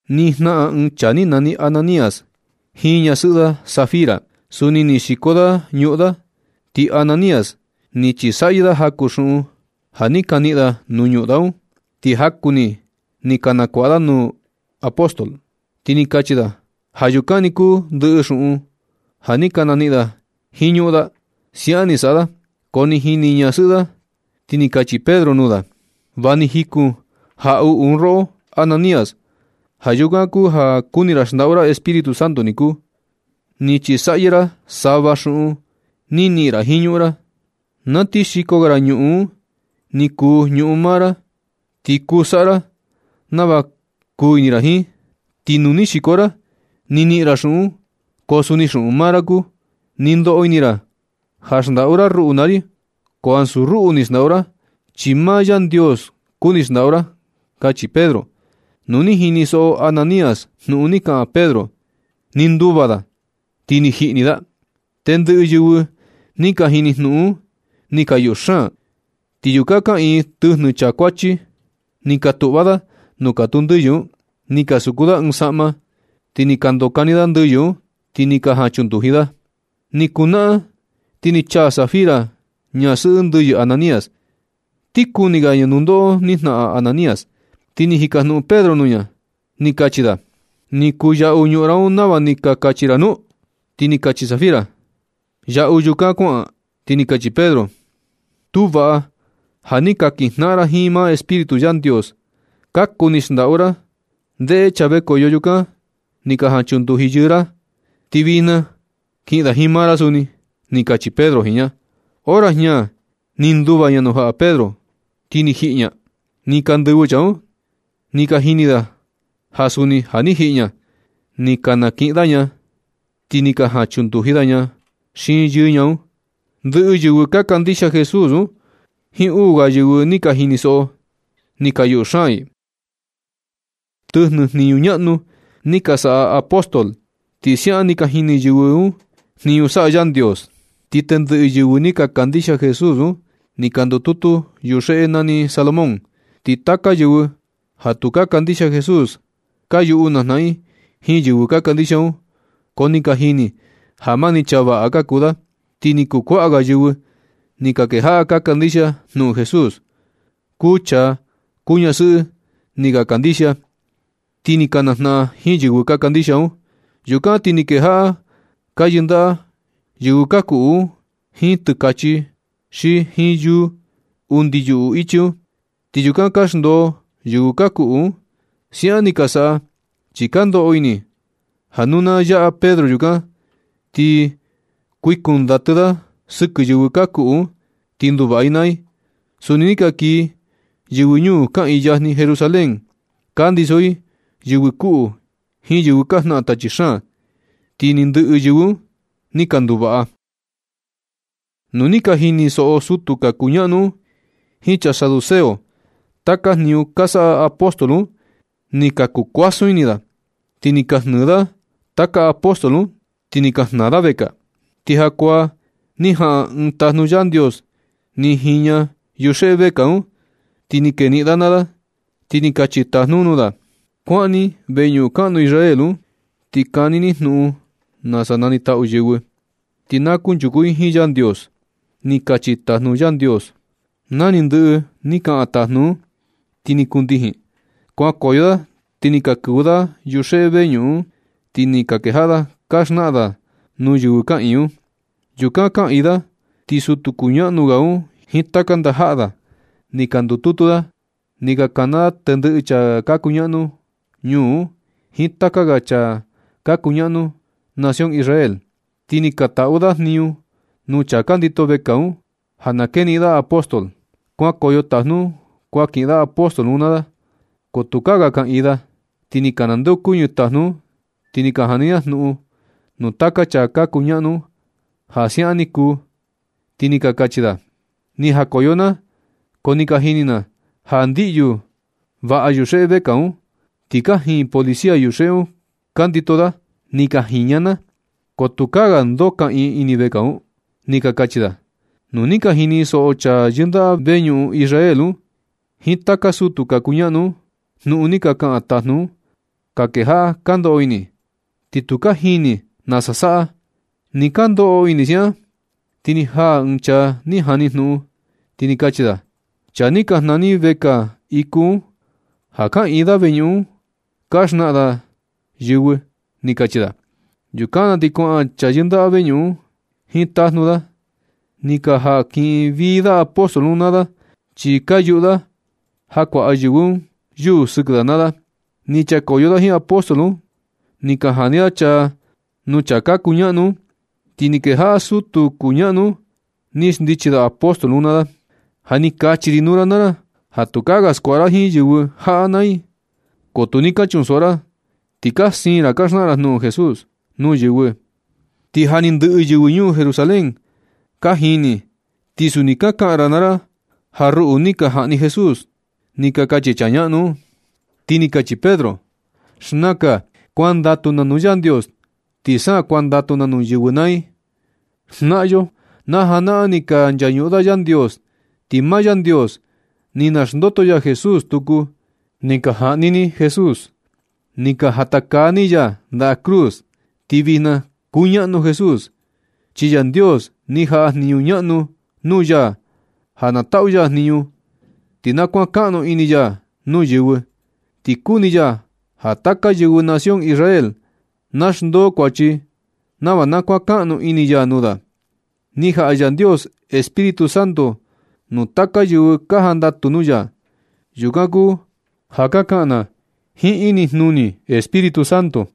Ni jnaꞌan ɨɨn chaa ni nani Ananías jiin ñasɨꞌɨ da Safira. Suni ni xiko da ñuꞌun da. Ti Ananías ni chisaꞌyɨ da jaku xuꞌun ja ni ka niꞌin da nuu ñuꞌun da un. Ti jaku ni ni nakuaꞌa da nuu apóstol, ti ni kachi da ja yukan ni kuu ndɨꞌɨ xuꞌun da ja ni ka niꞌin da jiin ñuꞌun da. Siaꞌan ni saꞌa da, ko ni jini ñasɨꞌɨ da. Ti ni kachi Pedro nuu da: ―Va ni jikun jaꞌuꞌu un roꞌo Ananías, ja yukan kuu ja kuni ra xndaꞌu ra Espíritu Santo niku. Ni chisaꞌyɨ ra sava xuꞌun ni niꞌin ra jiin ñuꞌun ra. Na ti xiko ga ra ñuꞌun un, ni kuu ñuꞌun maa ra, ti kuu saꞌa ra nava kuu ini ra jiin. Ti nu ni xiko ra, ni niꞌin ra xuꞌun un, ko suni xuꞌun maa ra kuu. Ni ndoꞌo ini ra ja xndaꞌu ra ruꞌu naa ri. Ko ansu ruꞌu ni xndaꞌu ra, chi maa Yandios kuni xndaꞌu ra ―kachi Pedro. Nu ni jinisoꞌo Ananías jnuꞌun ni kaꞌan Pedro, ni nduva da, ti ni jiꞌi ni da. Tendɨꞌɨ yɨvɨ ni ka jini jnuꞌun un ni ka yuꞌu xaan. Ti yukan kaꞌiin tɨjnɨ chaa kuachi. Ni ka tuꞌva da nuu katuu ndɨyɨ un, ni ka suku da ɨɨn saꞌma. Ni ka ndokani da ndɨyɨ un, ti ni ka jaꞌan chunduji da. Ni kuu naꞌan ti ni chaa Safira, ñasɨꞌɨ ndɨyɨ Ananías. Ti kuni ga ña nundoꞌo ni jnaꞌan Ananías. Ti ni jika jnuꞌun Pedro nuu ña, ni kachi da: ―¿Ni kuyaꞌu ñuꞌun un nava ni ka kachi ra nu? Ti ni kachi Safira: ―Yaꞌu yukan kuaꞌan. Ti ni kachi Pedro: ―Tu vaꞌa ja ni ka kijnaꞌan ra ti maa Espíritu Yandios ka kuni xndaꞌu ra. Ndeꞌe chaa vekoyo yukan ni ka jan chunduji yɨɨ ra, ti vijna kiꞌin da jiin maa ra suni ―ni kachi Pedro jiin ña. Hora jña ni nduva ña nuu jaꞌa Pedro, ti ni jiꞌi ni ña. Ni ka ndɨvɨ chaa un, ni ka jini da ja suni ja ni jiꞌi ña. Ni ka kaniꞌin da ña, ti ni ka jan chunduji da ña xiin yɨɨ ña un. Ndɨꞌɨ yɨvɨ ka kandixia Jesús un jiin uu ga yɨvɨ ni ka jinisoꞌo, ti ni ka yuꞌu xaan i. Tɨjnɨ jniñu ñaꞌnu ni ka saꞌa taka apóstol. Ti siaꞌan sa ni ka jini yɨvɨ un jniñu saꞌa Yandios. Ti tendɨꞌɨ yɨvɨ ni ka kandixia Jesús un ni ka ndututu yuxeꞌe nani Salomón. Ti taka yɨvɨ ja tu ka kandixia Jesús ka yuꞌu najnaꞌan jiin yɨvɨ ka kandixia un, ko ni ka jini ja mani chaa vaꞌa ka kuu da. Ti ni kuu kuaꞌa ga yɨvɨ ni ka kejaꞌa ka kandixia jnuꞌun Jesús. Kuu chaa, kuu ñasɨꞌɨ ni ka kandixia, ti ni ka najnaꞌan jiin yɨvɨ ka kandixia un. Yukan ti ka kejaꞌa ka yɨndaꞌa yɨvɨ ka kuꞌu un jiin tɨkachi xi jiin yuu. Undi yuꞌu ichi un, ti yukan ka xndoo yɨvɨ ka kuꞌu un. Siaꞌan ni ka saꞌa, chi ka ndoꞌo ini ja nu na yaꞌa Pedro yukan, ti kuikun ndatɨ da sɨkɨ yɨvɨ ka kuꞌu un, ti nduvaꞌa i naa i. Suni ni ka kii yɨvɨ ñuu kaꞌiin yajni Jerusalén. Ka ndiso i yɨvɨ kuꞌu jiin yɨvɨ ka jnaꞌan tachi xaan, ti ni ndɨꞌɨ un ni ka nduvaꞌa. Nu ni ka jinisoꞌo sutu ka kuñaꞌnu un jiin chaa saduceo taka jniñu ka saꞌa apóstol un, ni ka kuu kuasun ini da. Ti ni ka jnɨɨ da taka apóstol un, ti ni ka jnaa da vekaa. Ti jakuaa ni jaꞌan ɨɨn tajnu Yandios ni jiña yuxeꞌe vekaa un, ti ni keniꞌin da naa da, ti ni kachi tajnu un nuu da: ―Kuaꞌan ni veñuꞌun kaꞌnu Israel un, ti kani ni jnuꞌun nasa nanitaꞌu yɨvɨ, ti na kunchuku i jiin Yandios ―ni kachi tajnu Yandios. Sa ni ndɨꞌɨ ni kaꞌan tajnu un, ti ni kundijin. Kuankoyo da ti ni ka kɨvɨ da yuxeꞌe veñuꞌun un, ti ni ka kejaꞌa da ka xnaꞌan da nuu yɨvɨ kaꞌiin un. Yukan kaꞌiin da ti sutu kuñaꞌnu ga un jiin taka ndajaꞌa da ni ka ndututu da. Ni ka kana da tendɨꞌɨ chaa ka kuñaꞌnu ñuu un jiin taka ga chaa ka kuñaꞌnu nación Israel. Ti ni ka taꞌu da jniñu nuu chaa ka ndito vekaa un ja na keniꞌin da apóstol. Kuankoyo tajnu un kuan kiꞌin da apóstol un naa da. Ko tukaa ga kaꞌiin da. Ti ni ka nandeokuñɨ tajnu un ni ka jani da jnuꞌun nuu taka chaa ka kuñaꞌnu un ja siaꞌan ni kuu. Ti ni ka kachi da: ―Ni jakoyo na, ko ni ka jini na ja ndiꞌyu vaꞌa yuxeꞌe vekaa un. Ti kajiin policía yuxeꞌe un ka ndito da. Ni ka jiña na, ko tukaa ga ndoo kaꞌiin ini vekaa un ―ni ka kachi da. Nu ni ka jinisoꞌo chaa ka yindaꞌa veñuꞌun Israel un, jiin taka sutu ka kuñaꞌnu un, jnuꞌun ni ka kaꞌan tajnu un, ka kejaꞌa ka ndoꞌo ini. Ti tu ka jini nasa saꞌa. Nɨ ka ndoꞌo ini siaꞌan, ti ni jaa ɨɨn chaa ni jani jnuꞌun, ti ni kachi da: ―Chaa ni ka jnaa ni vekaa iku un, ja kaꞌiin da ini veñuꞌun un ka xnaꞌan da yɨvɨ ―ni kachi da. Yukan na ti kuaꞌan chaa ka yindaꞌa veñuꞌun un jiin tajnu da, ni ka jan kiꞌin vii da apóstol un naa da, chi ka yuꞌu da ja kuaꞌa yɨvɨ un yuu sɨkɨ da naa da. Ni chakoyo da jiin apóstol un, ni ka jani da chaa nuu chaa ka kuñaꞌnu un. Ti ni kejaꞌa sutu kuñaꞌnu un ni xndichi da apóstol un naa da: ―Ja ni kachi ri nuu ra naa ra ja tukaa ga skuaꞌa ra jiin yɨvɨ jaꞌa naa i, ko tu ni ka chunsoꞌo ra, ti ka siin ra ka xnaꞌan ra jnuꞌun Jesús nuu yɨvɨ. Ti ja ni ndɨꞌɨ yɨvɨ ñuu Jerusalén ka jini, ti suni ka kaꞌan ra naa ra ja ruꞌu ni ka jaꞌni Jesús ―ni ka kachi chaa ñaꞌnu un. Ti ni kachi Pedro: ―Xnakan kuandatu na nuu Yandios ti sa kuandatu na nuu yɨvɨ naa i. Jnaꞌan yo najanaꞌan, ni ka nchañuꞌun da Yandios, ti maa Yandios ni naxndoto ya Jesús tuku. Ni ka jaꞌni ni Jesús, ni ka jatakaa ni ya ndaꞌa cruz. Ti vijna kuñaꞌnu Jesús, chi Yandios ni jaꞌa jniñu ñaꞌnu nuu ya ja na taꞌu ya jniñu, ti na kuankaꞌnu ini ya nuu yɨvɨ. Ti kuni ya ja taka yɨvɨ nación Israel na xndoo kuachi nava na kuankaꞌnu ini ya nuu da. Ni jaꞌa Yandios Espíritu Santo nuu taka yɨvɨ ka jandatu nuu ya. Yukan kuu ja ka kaꞌan na jiin inijnuni Espíritu Santo,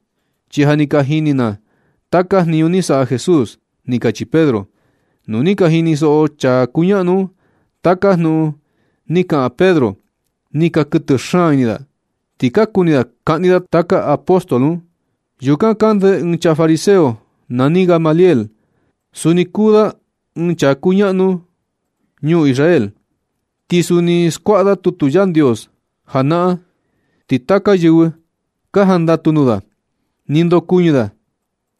chi ja ni ka jini na taka jniñu ni saꞌa Jesús ―ni kachi Pedro. Nu ni ka jinisoꞌo chaa ka kuñaꞌnu un taka jnuꞌun ni kaꞌan Pedro, ni ka kuɨtɨ xaan ini da, ti ka kuni da kaꞌni da taka apóstol un. Yukan kande ɨɨn chaa fariseo nani Gamaliel. Suni kuu da ɨɨn chaa kuñaꞌnu ñuu Israel. Ti suni ni skuaꞌa da tutu Yandios janaꞌan. Ti taka yɨvɨ ka jandatu nuu da. Ni ndokuɨñɨ da,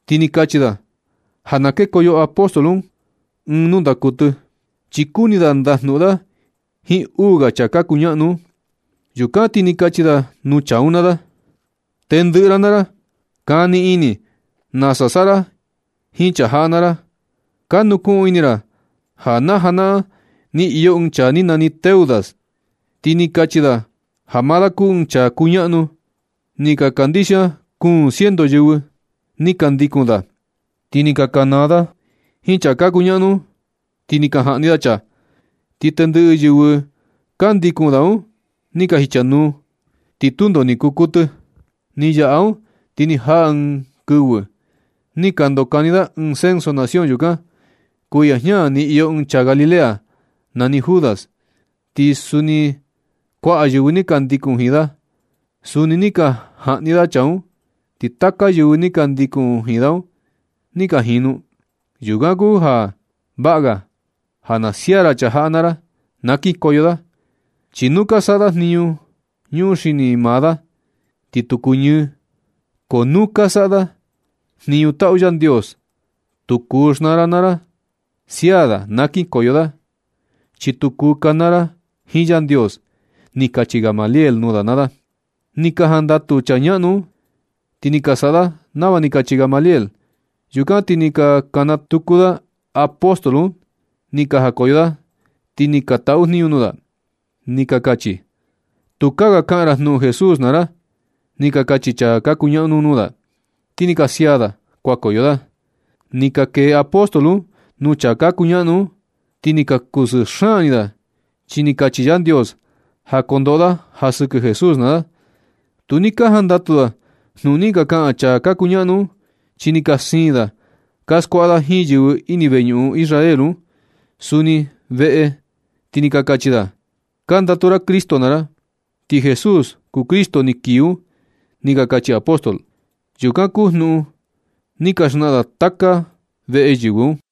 ti ni kachi da ja na kekoyo apóstol un ɨɨn nundaa kuɨtɨ, chi kuni da ndajnuꞌun da jiin uu ga chaa ka kuñaꞌnu un. Yukan ti ni kachi da nuu chaa un naa da: ―Tendɨꞌɨ ra naa ra, kani ini nasa saꞌa ra jiin chaa jaꞌa naa ra. Ka nukuꞌun ini ra ja na janaꞌan. Ni iyo ɨɨn chaa ni nani Teudas, ti ni kachi da ja maa da kuu ɨɨn chaa kuñaꞌnu. Ni ka kandixia kuun ciento yɨvɨ ni ka ndikun da. Ti ni ka kanaa da jiin chaa ka kuñaꞌnu un. Ti ni ka jaꞌni da chaa, ti ndɨꞌɨ yɨvɨ ka ndikun da un ni ka jichanuu, ti tundo ni kuu kuɨtɨ. Ni yaꞌa un ti ni jaa ɨɨn kɨvɨ ni ka ndokani da ɨɨn censo nación yukan. Kuiya jña ni iyo ɨɨn chaa Galilea nani Judas. Ti suni kuaꞌa yɨvɨ ni ka ndikun jiin da. Suni ni ka jaꞌni da chaa un, ti taka yɨvɨ ni ka ndikun jiin da un ni ka jinu. Yukan kuu ja vaꞌa ga ja na sia ra chaa jaꞌa naa ra. Na kinkoyo da. Chi nu ka saꞌa da ja ñuxini maa da, ti tu kuñɨɨ. Ko nu ka saꞌa da jniñu taꞌu Yandios, tu kuu xnaa ra naa ra. Sia da na kinkoyo da, chi tu kuu kanaa ra jiin Yandios ―ni kachi Gamaliel nuu da naa da. Ni ka jandatu chaa ñaꞌnu un, ti ni ka saꞌa da nava ni kachi Gamaliel. Yukan ti ni ka kana tuku da apóstol un ni ka jakoyo da, ti ni ka taꞌu jniñu nuu da. Ni ka kachi: ―Tukaa ga kaꞌan ra jnuꞌun Jesús naa ra ―ni ka kachi chaa ka kuñaꞌnu un nuu da. Ti ni ka sia da kuankoyo da. Ni ka kee apóstol un nuu chaa ka kuñaꞌnu un, ti ni ka kusɨɨ ini da, chi ni kachi Yandios ja kondoꞌo da ja sɨkɨ Jesús naa da. Tu ni ka jandatu da jnuꞌun ni ka kaꞌan chaa ka kuñaꞌnu un, chi ni ka siin da ka skuaꞌa da jiin yɨvɨ ini veñuꞌun Israel, ti suni veꞌe, ti ni ka kachi da: ―Ka ndatu ra Cristo naa ra, ti Jesús kuu Cristo ni kii un ―ni ka kachi apóstol. Yukan kuu jnuꞌun ni ka xnaꞌan da taka veꞌe yɨvɨ un.